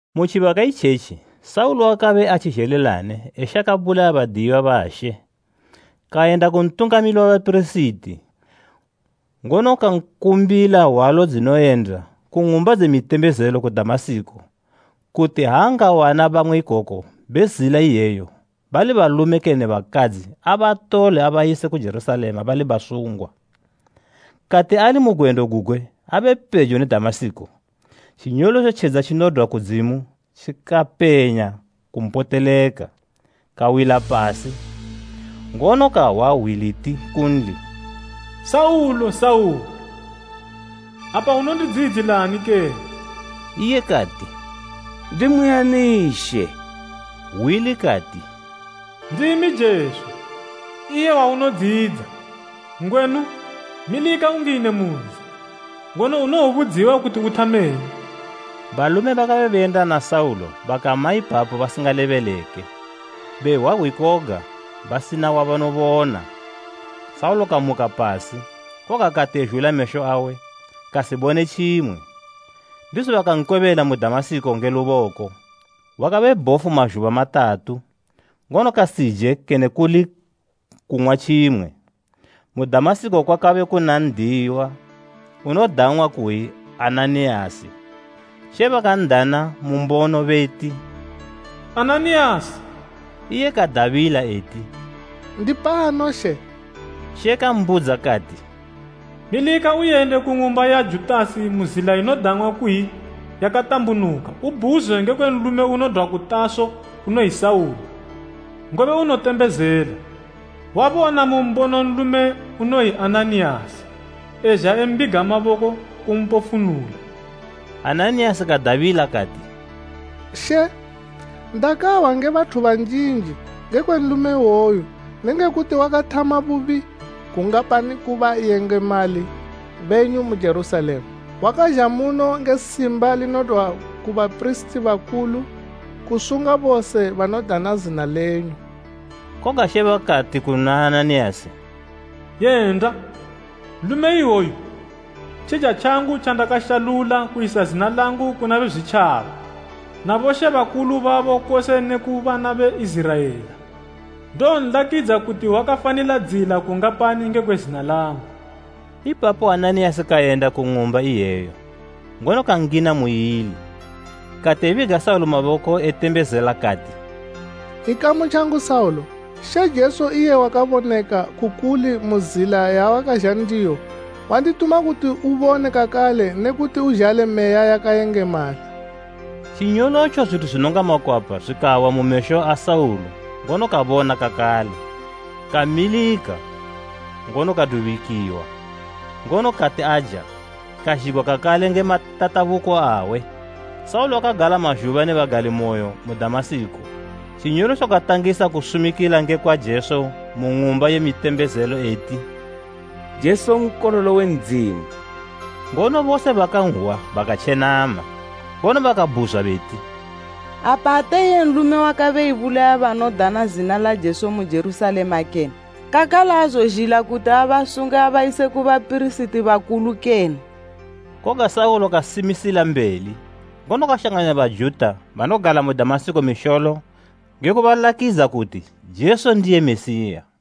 Mu tjibaka itjetji Saulo wakabe atjizhelilane eshaka bulaya badiyiwa ba She. Kayenda ku Ntungamili we bapirisiti ngono kankumbila hwalo dzinoyenda ku ng'umba dze mitembezelo ku Damasiko kuti ha angawana bamwe ikoko be Zila iyeyo bali balume kene bakadzi abatole abayise ku Jerusalema bali basungwa. Kati ali mu gwendo gugwe abe pejo ne Damasiko, tjinyolotjo tjedza tjinodwa kudzimu tjikapenya kumpoteleka. Kawila pasi, ngono kahwa hwi liti kunli, “Saulo, Saulo, apa unondidziyidzilani kene?” Iye kati, “Ndimwi ani She?” Hwi likati, “Ndimi Jesu, iye waunodziyidza. Ngwenu, milika ungine mu nzi, ngono unowobudziwa kuti uthameni.” Balume bakabe beyenda na Saulo bakama ipapo basingalebeleke; behwa hwi koga basina wabanobona. Saulo kamuka pasi, koga kati ezhula mesho awe, kasibone tjimwe. Ndizo bakankwebela mu Damasiko nge luboko. Wakabe bhofu mazhuba matatu, ngono kasije kene kuli kung'wa tjimwe. Mu Damasiko kwakabe kuna n'diyiwa unodang'wa kuyi Ananiyasi. She bakan'dana mu mbono beti, “Ananiyasi!” Iye kadabila eti, “Ndipano She.” She kambudza kati, “Milika uyende ku ng'umba ya Judasi mu zila inodang'wa kuyi, Yakatambunuka ubhuzwe ngekwe nlume unodwa ku Taso unoyi Saulo, ngobe unotembezela. Wabona mu mbono nlume unoyi Ananiyasi ezha embiga maboko kumpofunula.” Ananiyasi kadabila kati, “She, ndakahwa nge bathu banjinji ngekwe nlume iwoyu nenge kuti wakathama bubi gungapani ku bayengemali benyu mu Jerusalema. Wakazha muno nge simba linodwa ku bapirisiti bakulu kusunga bose banodana zina lenyu.” Koga She bakati kuna Ananiyasi, “Yenda! Nlume iwoyu tjija tjangu tjandakashalula kuyisa zina langu kuna Bezwitjaba na bomambo babo kose neku bana be Iziraela. Ndowonlakidza kuti wakafanila dziyila kungapani ngekwe zina langu.” Ipapo Ananiyasi kayenda ku ng'umba iyeyo, ngono kangina muili. Kati ebiga Saulo maboko etembezelela kati, “Ikamu tjangu Saulo, She Jesu iye wakaboneka ku kuli mu zila yawakazha ndiyo, wandituma kuti ubone kakale ne kuti uzhale Meya yakayengemala.” Tjinyolotjo zwithu zwinonga makwapa zwikawa mu mesho a Saulo ngono kabona kakale. Kamilika, ngono kadubikiwa, ngono kati aja, kazhigwa kakale nge matatabuko awe. Saulo unosumikila mu Damasiko Saulo wakagala mazhuba ne bagalimoyo mu Damasiko. Tjinyolotjo katangisa kusumikila ngekwa Jesu mu ng'umba ye mitembezelo eti, “Jesu Nkololo we Ndzimu.” Ngono bose bakanhwa bakatjenama, ngono bakabhuzwa beti, “Apa ate iye nlume wakabe ebulaya banodana zina la Jesu mu Jerusalema kene? Kakale aazozhila kuti abasunge abayise ku bapirisiti bakulu kene?” Koga Saulo kasimila mbeli, ngono kashanganya Bajuta banogala mu Damasiko misholo nge kubalakidza kuti Jesu ndiye Mesiya.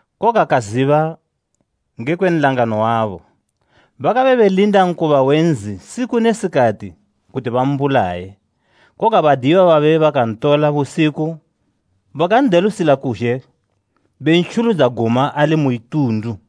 koga kaziba ngekwe nlangano wabo. Bakabe belinda nkoba we nzi siku ne sikati kuti bambulaye. Koga badiyiwa babe bakantola busiku bakan'delusila kuzhe bentjuludza guma ali mu itundu.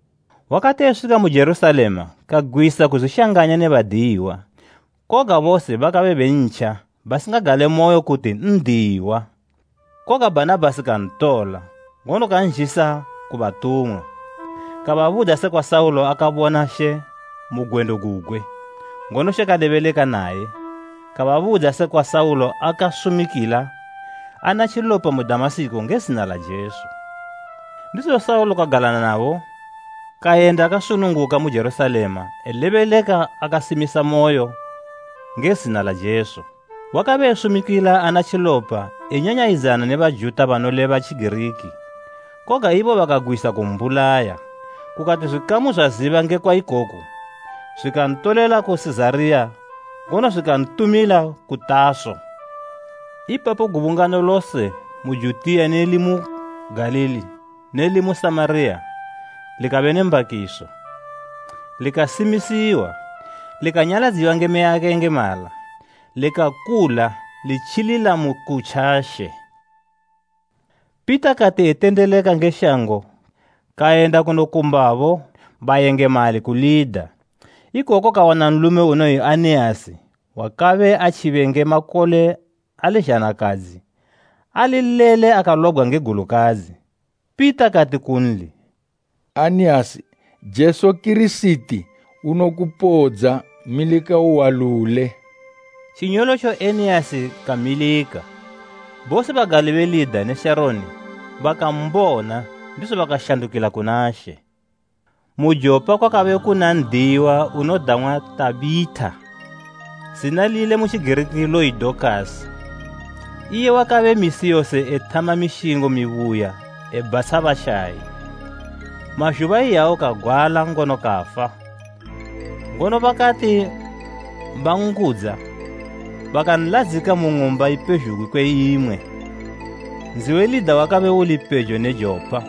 Wakati eswika mu Jerusalema kagwisa kuzwishanganya ne badiyiwa, koga bose bakabe bentja basingagalemoyo kuti n'diyiwa. Koga Bhanabhasi kantola, ngono kanzhisa ku batumwa. Kababudza sekwa Saulo akabona She mu gwendo gugwe, ngono She kalebeleka naye, kababudza sekwa Saulo akasumikila ana tjilopa mu Damasiko nge zina la Jesu. Ndizo Saulo kagala nabo kayenda akasununguka mu Jerusalema elebeleka akasimisamoyo nge zina la Jesu. Wakabe esumikila ana tjilopa enyanyayidzana ne Bajuta banoleba Tjigiriki, koga ibo bakagwisa kumbulaya. Kukati zwikamu zwaziba ngekwa ikoku zwikantolela ku Sizariya ngono zwikantumila ku Taso. Ipapo gubungano lose mu Judiya ne limu Galili ne limu Samariya likabe ne mbakiso, likasimisiwa, likanyaladziwa nge Meya yakayengemala, likakula litjilila mu kutja She. Pita kati etendeleka nge shango kayenda kunokumbabo bayengemali ku Lida. Ikoko kawana nlume unoyi Aneasi wakabe atjibe nge makole ali zhanakadzi ali lele akalobgwa nge gulukadzi. Pita kati kunli, “Aneasi, Jesu Kirisiti unokupodza. Milika uwalule.” Tjinyolotjo Eneasi kamilika. Bose bagali be Lida ne Sharoni bakambona ndizo bakashandukila kuna She. Mu Jopa kwakabe kuna n'diyiwa unodang'wa Tabhita. Zina lile mu Tjigiriki loyi Dokasi. Iye wakabe misi yose ethama mishingo mibuya ebhatsha bashayi. Mazhuba iyawo kagwala ngono kafa, ngono bakati banngudza bakanladzika mu ng'umba ipezhugwi kwe imwe. Nzi we Lida wakabe uli pejo ne Jopa.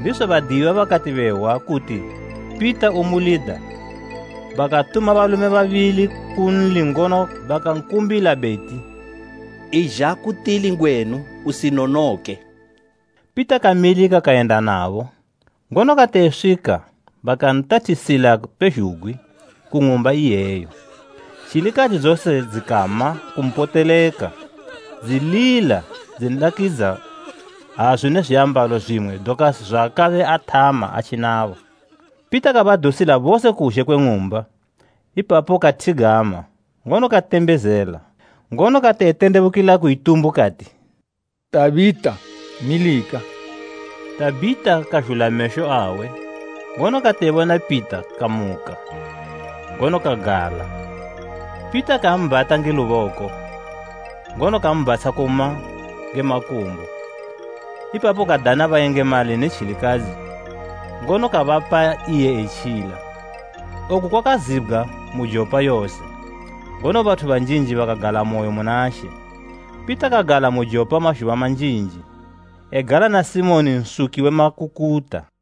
Ndizo badiyiwa bakati behwa kuti Pita umu Lida bakatuma balume babili kunli ngono bakankumbila beti, “Izha ku tili ngwenu usinonoke.” Pita kamilika kayenda nabo, ngono kati eswika bakantathisila pezhugwi ku ng'umba iyeyo. Tjilikadzi dzose dzikama kumpoteleka dzilila dzinlakidza hazu ne zwiambalo zwimwe Dokasi zwaakabe athama atji nabo. Pita kabadusila bose kuzhe kwe ng'umba; ipapo kathigama ngono katembezela, ngono kati etendebukila ku itumbu kati, “Tabhita, milika.” Tabhita kazhula mesho awe, ngono kati ebona Pita kamuka, ngono kagala. Pita kambhata nge luboko, ngono kambatsha kuma nge makumbo. Ipapo kadana bayengemali ne tjilikadzi, ngono kabapa iye etjila. Oku kwakazibgwa mu Jopa yose, ngono bathu banjinji bakagalamoyo muna She. Pita kagala mu Jopa mazhuba manjinji, egala na Simoni nsuki we makukuta.